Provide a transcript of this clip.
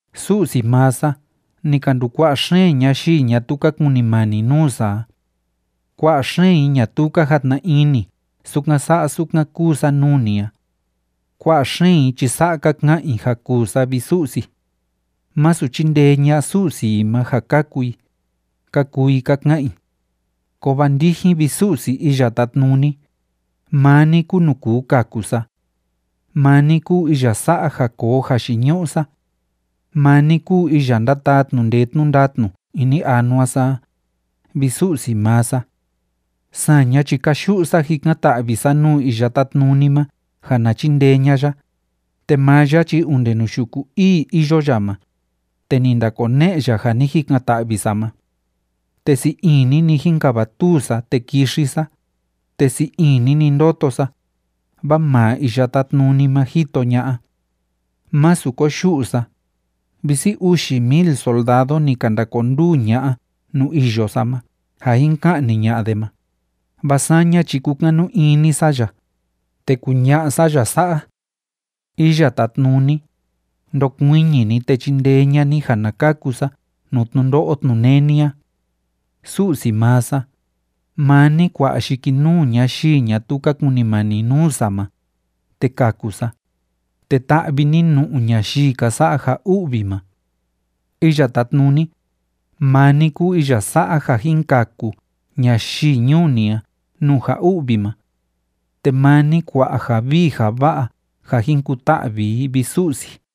Su'si maa sa, ni ka ndukua'a xeen ñayii ñatuu ka kunimani nuu sa a. Kua'a xeen i ñatuu ka jatna ini sukan sa'a sukan kúu sa nuu ni a. Kua'a xeen i chi sa'a ka ka'an i ja kuu sa, vi Su'si: “Masu chindee ña'a Su'si i ma ja kaku i”, ka kuu i ka ka'an i. Kovaa ndijin, vi Su'si Iya Tátnuni, maa ni kúu nuu kuu kaku sa. Maa ni kúu iya sa'a ja koo jayiñu'u sa. Maa ni kúu iya ndátaa tnu'u ndee tnu'u ndatnu ini anua sa a, vi Su'si maa sa. Saña chi káyu'u sa jikan‑ta'vi sa nuu Iya Tátnuni ma ja na chindee ña'a ya, te maa ya chi onde nuu yuku ii iyo ya ma, te ni ndakone'e ya ja ni jikan‑ta'vi sa ma. Te sii ini‑ni jínkavatuu sa, te kixi sa, te sii ini‑ni ndóto sa, vaa maa Iya Tátnuni ma jito ña'a. Masu koyu'u sa, visi uxi mil soldado ni ka ndakonduu ña'a nuu iyo sa ma ja jin ka'ni ña'a de ma, vaa saña chi kúkanu ini sa ya, te kuña'a sa ya sa'a: “Iya Tátnuni, ndokuiñi ni, te chindee ña'a ni ja na kaku sa nuu tnundo'o tnuneni a. Su'si maa sa, maa ni kua'a yikinuu ñayii ñatuu ka kunimani nuu sa ma, te kaku sa, te ta'vi ni nu'u ñayii ka sa'a ja u'vi ma. Iya Tátnuni, maa ni kúu iya sa'a ja jin kaku ñayii ñuu ni a nuu ja u'vi ma. Te maa ni kua'a ja vii ja va'a ja jin kuta'vi i, vi Su'si.”